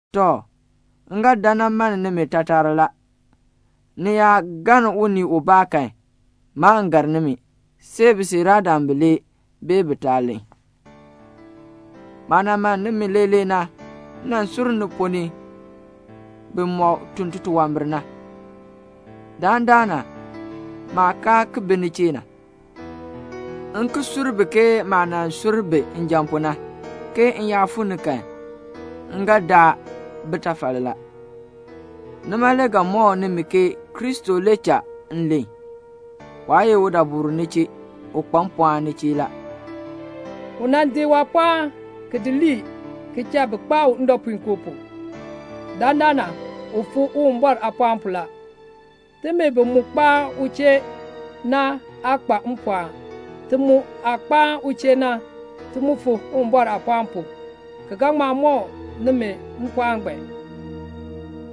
Tɔ, m ga dan nan mann nimi taatar la. Ni yaa galn unii ubaa kan, maan gar nimi, see bisiiraadam bilee bee bitaa len. Maah nan mann nimi leelee na, m nan sur ni ponn ni bimɔk tun titunwambir na. Dandana maah kaa bi ni chee na, m ki sur bi ke maah nan sur bi njan pu na, ke m yaa fuu ni kan, m ga daa bitafal la. Nima le ga mɔk nimi ke Kristo le cha m len. Waa ye udabur ni chee. U kpa mpɔɔn ni chee la. U nan di waapɔɔn ki di lii ki cha bi kpaa u ndɔpuinkoo pu. Dandana u fu Uwumbɔr aapɔɔn pu la. Timi bi mu kpaan u chee na aa kpa mpɔɔn. Ti mu aah kpaan u chee na, ti mu fu Uwumbɔr aapɔɔn pu, ki ga ŋma mɔk nimi mpɔɔn ngbaan.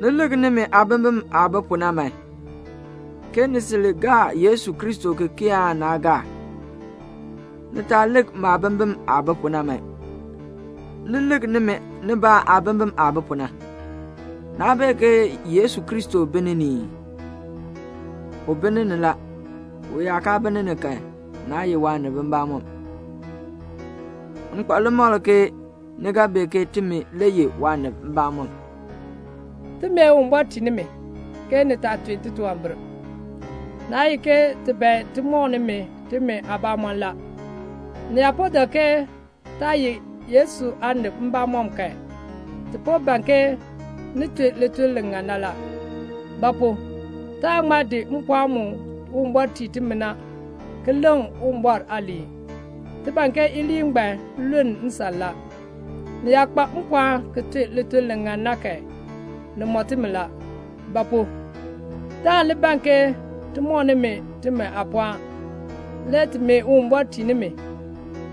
Ni lik nimi aabimbin aah bi pu na man, ke ni sil gaa Yesu Kristo ki kii aan naa gaa. Ni taa lik maabimbin aah bi pu na man. Ni li lik nimi nibaa aabimbin aah bi pu na. Naa bee ke Yesu Kristo bi ni ni ii? U bi ni ni la; u yaa kaa bi ni ni kan, naa ye waanib mbamɔm. M kpa limakl ke ni ga bee ke timi le ye waanib mbamɔm. Ti mee Uwumbɔr tii nimi, ke ni taa tun titunwambir. Naa ye ke ti ban ti mɔk nimi timi aabamɔn la. Ni yaa po dak ke taa ye Yesu aanib mbamɔm kan, ti po ban ke ni tun lituln li ŋan na la. Ba pu? taan ŋma di mpɔɔn mu Uwumbɔr tii timi na, ki leŋ Uwumbɔr aaliin. Ti ban ke iliin ngbaan luln nsan la. Ni yaa kpa mpɔɔn ki tun lituln li ŋan na kan, ni mɔ timi la; ba pu? taan li ban ke ti mɔk nimi timi aapɔɔn. Le ti mee Uwumbɔr tii nimi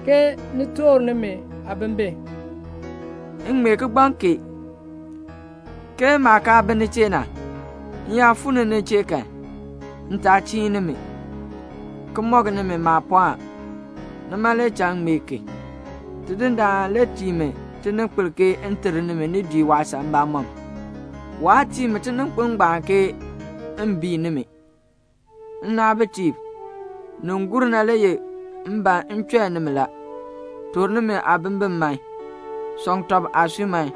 ke ni toor nimi aabimbin. M ŋmee kigbaŋ kee, ke maah kaa bi ni chee na, m yaa fuu ni ni chee kan, m taa chiin nimi, ki mɔk nimi maapɔɔn. Nima le cha m ŋmee ki. Tidindaan le tii mi tininkpil ke m ter nimi ni dii waasan mbamɔm. Waa tii mi tininkpil ngbaan ke m bii nimi. Nnaabitiib, nin gur na le ye m ban m chɔi nimi la. Toor nimi aabimbin man. Sɔŋ tɔb aasui man.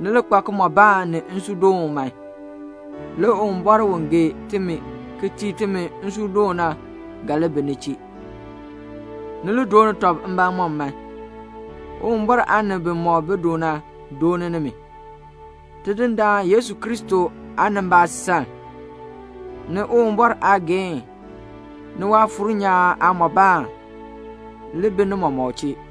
Ni li kpa kimɔbaan ni nsuudoon man. Le Uwumbɔr u gee timi ki tii timi nsuudoon na ga li bi ni chee. Ni li dooni tɔb mbamɔm man. Uwumbɔr aanib bimɔk bi du na dooni nimi. Tidindaan Yesu Kristo aanimbaasaln, ni Uwumbɔr aageehn, ni Waafuur nyaan aamɔbaan, li bi ni mɔmɔk chee.